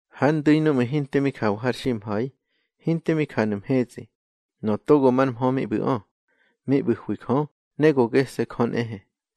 Har ndu̱i núꞌmu̱ hinte mi jawa har ximha̱i, hinte mi janu̱ mhetsꞌi, Nöꞌö Togo mar Mhö mi ꞌbu̱ꞌö, mi ꞌbu̱hwi Jö, ne go gese̱ Jö nꞌehe.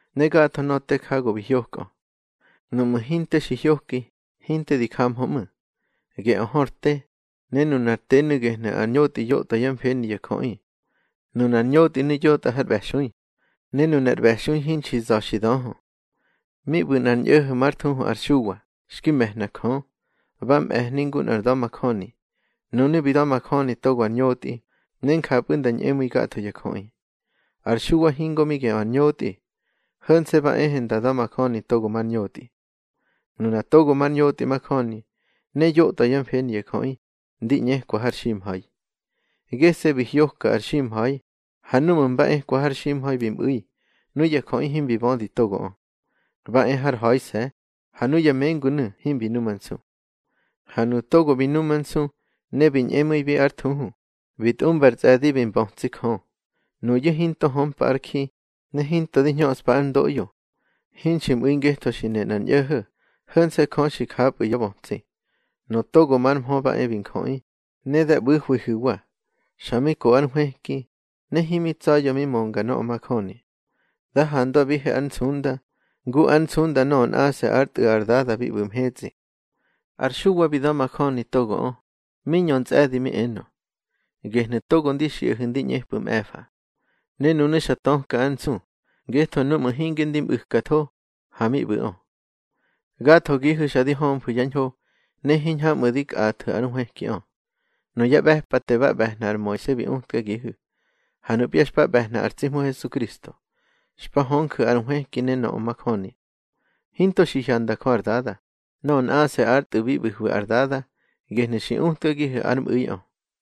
Ne gatho nöꞌö te ja go bi hyokꞌö. Nuꞌmu̱ hinte xi hyoki, hinte di jamhö ꞌmu̱. Geꞌö hör te, ne nunar tenu̱ gehnu̱ ar ñotꞌi yotꞌwa yá mfeni ya jöꞌi. Nunar ñotꞌinu̱ yotꞌa har ꞌbe̱xui, ne nunar ꞌbe̱xui hinxi za̱ xi döhö. Mi ꞌbu̱ nꞌar ñꞌo̱ho̱ már thuhu ar Xuwa, xki me̱hna Jö. Ba ꞌbe̱hni ngu nꞌar nda̱majöni. Nunu̱ bi da̱majöni togo ar ñotꞌi, ne njapꞌu̱ nda ñꞌemu̱i gatho ya jöꞌi. Ar Xuwa hingo mi geꞌö ar ñotꞌi, ho̱nse̱ ba ehe nda da̱majöni togo mar ñotꞌi. Nuna togo mar ñotꞌi majöni, ne yotꞌwa yá mfeni ya jöꞌi, ndi ꞌñekwa har ximha̱i. Gese̱ bi hyoka ar ximha̱i, ha núꞌmu̱ mba ekwa har ximha̱i bi mꞌu̱i, nuya jöꞌi himbi bödi togoꞌö. Ba e hár ha̱ise̱, ha nuya mengunu̱ himbi numansu. Ha nuꞌu̱ togo bi numansu, ne bi ñꞌemu̱ibi ár thuhu, bi tꞌumba ar tsꞌe̱di bi mbötsi Jö. Nuyu̱ hinto hömpa ár ji, ne hinto di hñöꞌspa ár ndoꞌyo, hinxi mꞌu̱i ngetho xi ne nꞌar ñꞌo̱ho̱, ho̱nse̱ Jö xi japꞌu̱ yá bötsi. Nöꞌö Togo mar Mhö ba e bi njöꞌi, ne da ꞌbu̱hwihu̱wa. Xa mi ko ár nhwëki, ne himi tsa̱ya̱ mi mönga nöꞌö majöni. Da handwabihe ár nsunda, ngu ár nsunda nöꞌö nꞌase̱ ár Tꞌu̱ ar Dada bi ꞌbu̱ mhetsꞌi. Ar Xuwa bi da̱majöni togoꞌö, mi ñö ntsꞌe̱di mi enö: —Gehnu̱ togo ndi xiꞌahu̱ ndi ꞌñepꞌu̱ mꞌe̱fa. Ne nunu̱ xa töka ár nsu, ngetho núꞌmu̱ hinge ndi mꞌu̱katho, ha mi ꞌbu̱ꞌö. Gathogihu̱ xa di hömfu̱ yá ñho, ne hiñhamꞌu̱ di kꞌathu̱ ár nhwëkiꞌö. Nuya ꞌbe̱pate ba ꞌbe̱hna ar Moise bi utkagihu̱. Ha nupya xpa ꞌbe̱hna ar tsi Hmu Hesukristo, xpa hönju̱ ar nhwëki ne nöꞌö majöni. Hinto xi hyanda Jö ar Dada. Nöꞌö nꞌase̱ ár Tꞌu̱ bi ꞌbu̱hwi ar Dada, gehnu̱ xi utkagihu̱ ár mꞌu̱iꞌö.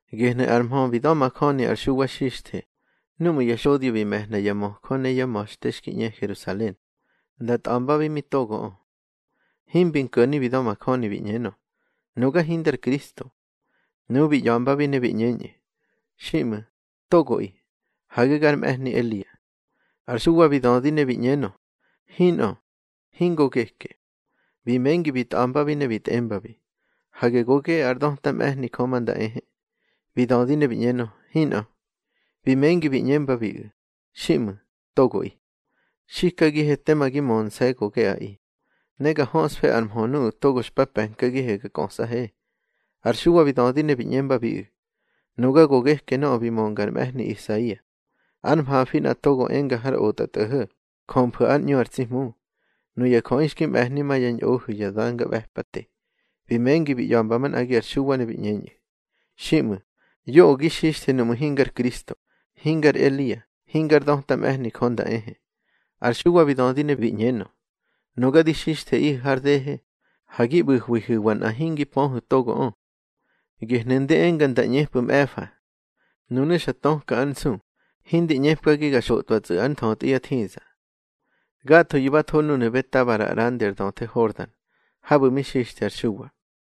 Gehnu̱ ar mhö bi da̱majöni ar Xuwa Xixthe, núꞌmu̱ ya xodyo bi me̱hna ya möjö ne yá ma̱xte xki ꞌñe Herusalen, nda tꞌa̱mbabi mi togoꞌö. Himbi nko̱ni bi da̱majöni bi ꞌñenö: —Nuga hindar Kristo. Nuꞌu̱ bi ꞌya̱mbabi ne bi ꞌñeñꞌu̱: —Xiꞌmu̱, togoꞌi. Hage gar mꞌe̱hni Elia. Ar Xuwa bi dödi ne bi ꞌñenö: —Hinꞌö, hingo geke. Bi mengi bi tꞌa̱mbabi ne bi tꞌembabi: —Hage go geꞌe ár döta mꞌe̱hni Jö ma nda ehe. Bi dödi ne bi ꞌñenö: —Hinꞌö. Bi mengi bi ꞌñembabiꞌu̱: —Xiꞌmu̱, togoꞌi. Xikagihe tema gi mönse̱ go geꞌaꞌi. Ne ga höꞌsfe ar mhö nuꞌu̱ togo xpa pe̱nkagihe ga kꞌösꞌahe. Ar Xuwa bi dödi ne bi ꞌñembabiꞌu̱: —Nuga go geke nöꞌö bi mönga ar mꞌe̱hni Isaia: Ár mhafi nꞌa togo enga har otꞌatꞌo̱ho̱: Jömfu̱ ár ꞌñu ar tsi Hmu. Nuya jöꞌi xki mꞌe̱hni ma yá ñꞌohu̱ ya de̱ngaꞌbe̱pate. Bi mengi bi ꞌya̱mba manꞌagi ar Xuwa ne bi ꞌñeñꞌu̱: —Xiꞌmu̱, yoꞌö gi xixthe nuꞌmu̱ hingar Kristo, hingar Elia, hingár döta mꞌe̱hni Jö nda ehe. Ar Xuwa bi dödi ne bi ꞌñenö: —Nuga di xixtheꞌihu̱ har dehe, ha gi ꞌbu̱hwihu̱wa nꞌa hingi pöhu̱ togoꞌö. Gehnu̱ ndi enga nda ꞌñepꞌu̱ mꞌe̱fa. Nunu̱ xa töka ár nsu, hindi ꞌñepkagi ga xotꞌwatsꞌu̱ ár nthötꞌi yá thiza. Gathoyu̱ ba tho núnu̱ Betabara ꞌrandi ar döthe Hordan, habu̱ mi xixthe ar Xuwa.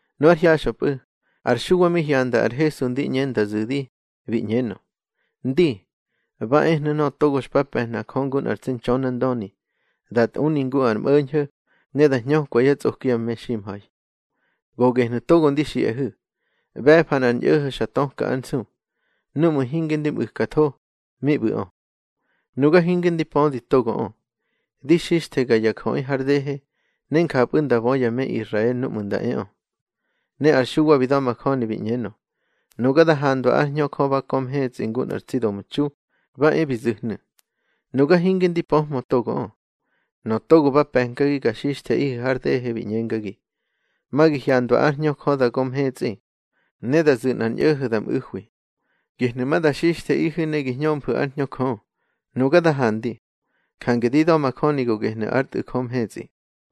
Nu ár hyaxꞌöpꞌu̱, ar Xuwa mi hyanda ar Hesu ndi ꞌñe nda zu̱di, bi ꞌñenö: —Ndi, ba ehnu̱ togo xpa pe̱hna Jö ngu nꞌar tsi Ntxönandöni, da tꞌuni ngu ar mꞌo̱ñho̱, ne da hñökwa yá tsꞌoki ya meximha̱i. Go gehnu̱ togo ndi xiꞌahu̱: ꞌBe̱fa nꞌar ñꞌo̱ho̱ xa töka ár nsu. Núꞌmu̱ hinge ndi mꞌu̱katho, mi ꞌbu̱ꞌö. Nuga hinge ndi pödi togoꞌö. Di xixthega ya jöꞌi har dehe, ne njapꞌu̱ nda bö ya me Israel núꞌmu̱ nda eꞌö. Ne ar Xuwa bi da̱majöni bi ꞌñenö: —Nuga da handwa ár Hñö Jö ba kö mhetsꞌi ngu nꞌar tsi domtxu, ba e bi zu̱hnu̱. Nuga hinge ndi pöhmö togoꞌö. Nöꞌö togo ba pe̱nkagi ga xixtheꞌihu̱ har dehe bi ꞌñengagi: Ma gi hyandwa ár Hñö Jö da gö mhetsꞌi, ne da zu̱ nꞌar ñꞌo̱ho̱ da mꞌu̱hwi. Gehnu̱ ma da xixtheꞌihu̱ ne gi hñömfu̱ ár Hñö Jö. Nuga da handi, jange di da̱majöni go gehnu̱ ár Tꞌu̱ Jö mhetsꞌi.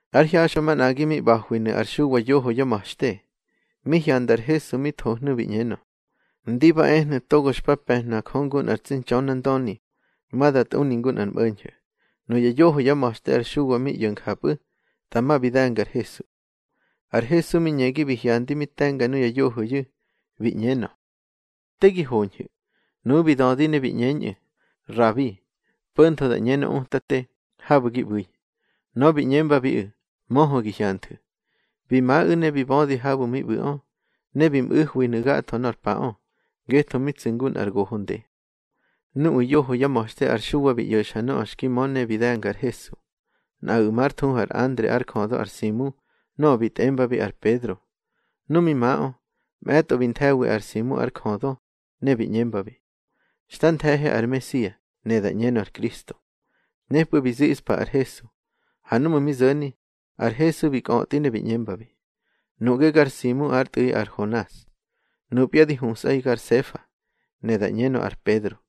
Ár hyaxꞌö manꞌagi mi ꞌba̱hwinu̱ ar Xuwa yoho yá ma̱xte. Mi hyanda ar Hesu mi thohnu̱ bi ꞌñenö: —Ndi ba ehnu̱ togo xpa pe̱hna Jö ngu nꞌar tsi Ntxönandöni, ma da tꞌuni ngu ar mꞌo̱ñho̱. Nuya yoho yá ma̱xte ar Xuwa mi ꞌyo̱ njapꞌu̱, dama bi de̱nga ar Hesu. Ar Hesu mi ñegi bi hyandi mi te̱nga nuya yohoyu̱, bi ꞌñenö: —Te gi hoñhu̱. Nuꞌu̱ bi dödi ne bi ꞌñeñꞌu̱: —Rabi (po̱ntho da ꞌñenö Utate), habu̱ gi ꞌbu̱i. Nöꞌö bi ꞌñembabiꞌu̱: —Möhö gi hyanthu̱. Bi maꞌu̱ ne bi bödi habu̱ mi ꞌbu̱ꞌö. Ne bi mꞌu̱hwinu̱ gatho nor paꞌö, ngetho mi tsu̱ ngu nꞌar goho nde. Nuꞌu̱ yoho yá ma̱xte ar Xuwa bi ꞌyo̱xa nöꞌö xki mö ne bi de̱nga ar Hesu, nꞌaꞌu̱ már thuhu ar Andre ár jödö ar Simu nöꞌö bi tꞌembabi ar Pedro. Nu mi maꞌö, mꞌe̱tꞌo bi nthe̱wi ar Simu ár jödö, ne bi ꞌñembabi: —Xta nthe̱he ar Mesia (ne da ꞌñenö ar Kristo). Nepꞌu̱ bi ziꞌspa ar Hesu. Ha núꞌmu̱ mi zo̱ni, ar Hesu bi kꞌötꞌi ne bi ꞌñembabi: —Nuꞌge gar Simu ár tꞌu̱ꞌi ar Honas. Nupya di husꞌaꞌi gar Sefa (ne da ꞌñenö ar Pedro).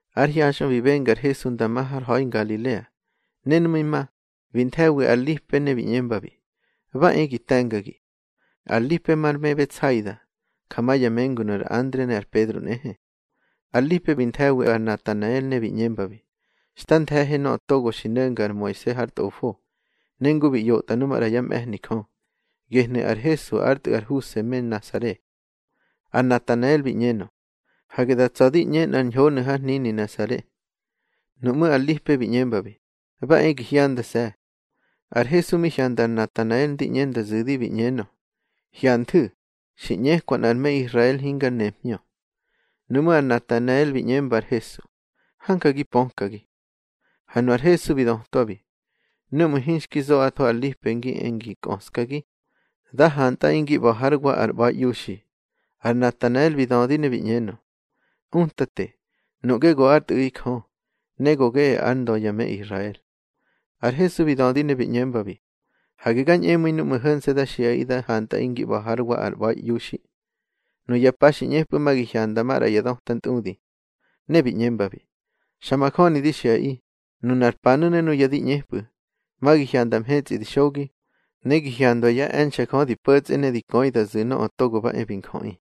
Ár hyaxꞌö bi benga ar Hesu nda ma har ha̱i Ngalilea, ne nu mi ma, bi nthe̱wi ar Lipe ne bi ꞌñembabi: —Ba e gi te̱ngagi. Ar Lipe mar me Betsaida, ja ma ya mengunu̱ ar Andre ne ar Pedro nꞌehe. Ar Lipe bi nthe̱wi ar Natanael ne bi ꞌñembabi: —Xta nthe̱he nöꞌö togo xi no̱nga ar Moise hár tꞌofo, ne ngu bi ꞌyotꞌa nu maꞌra yá mꞌe̱hni Jö. Gehnu̱ ar Hesu ár tꞌu̱ ar Huse me Nasare. Ar Natanael bi ꞌñenö: —Hage da tsa̱ di ꞌñe nꞌar ñhonu̱ har hnini Nasare. Nuꞌmú̱ ar Lipe bi ꞌñembabi: —Ba e gi hyandase̱. Ar Hesu mi hyanda ar Natanael ndi ꞌñe nda zu̱di, bi ꞌñenö: —Hyanthu̱, xi ꞌñekwa nꞌar me Israel hingar nemhñö. Nuꞌmú̱ ar Natanael bi ꞌñemba ar Hesu: —Hanja gi pökagi. Ha nu ar Hesu bi dötwabi: —Núꞌmu̱ hinxki zoꞌatho ar Lipe ngi e ngi kꞌöskagi, da hantꞌaꞌi ngi ꞌba̱ hár wa ar ꞌba̱iꞌiuxi. Ar Natanael bi dödi ne bi ꞌñenö: —Utate, nuꞌge go ár Tꞌu̱ꞌi Jö, ne go geꞌe ár Ndö ya me Israel. Ar Hesu bi dödi ne bi ꞌñembabi: —Hage ga ñꞌemu̱i núꞌmu̱ ho̱nse̱ da xiꞌaꞌi da hantꞌaꞌi ngi ꞌba̱ hár wa ar ꞌba̱iꞌiuxi. Nuya pa xi ꞌñepꞌu̱ ma gi hyanda maꞌra ya döta ntꞌudi. Ne bi ꞌñembabi: —Xa majöni di xiꞌaꞌi, nunar panu̱ ne nuya di ꞌñepꞌu̱, ma gi hyanda mhetsꞌi di xogi, ne gi hyandwa yá e̱nxe̱ Jö di po̱tsꞌe ne di köi da zu̱ Nöꞌö Togo ba e bi Njöꞌi.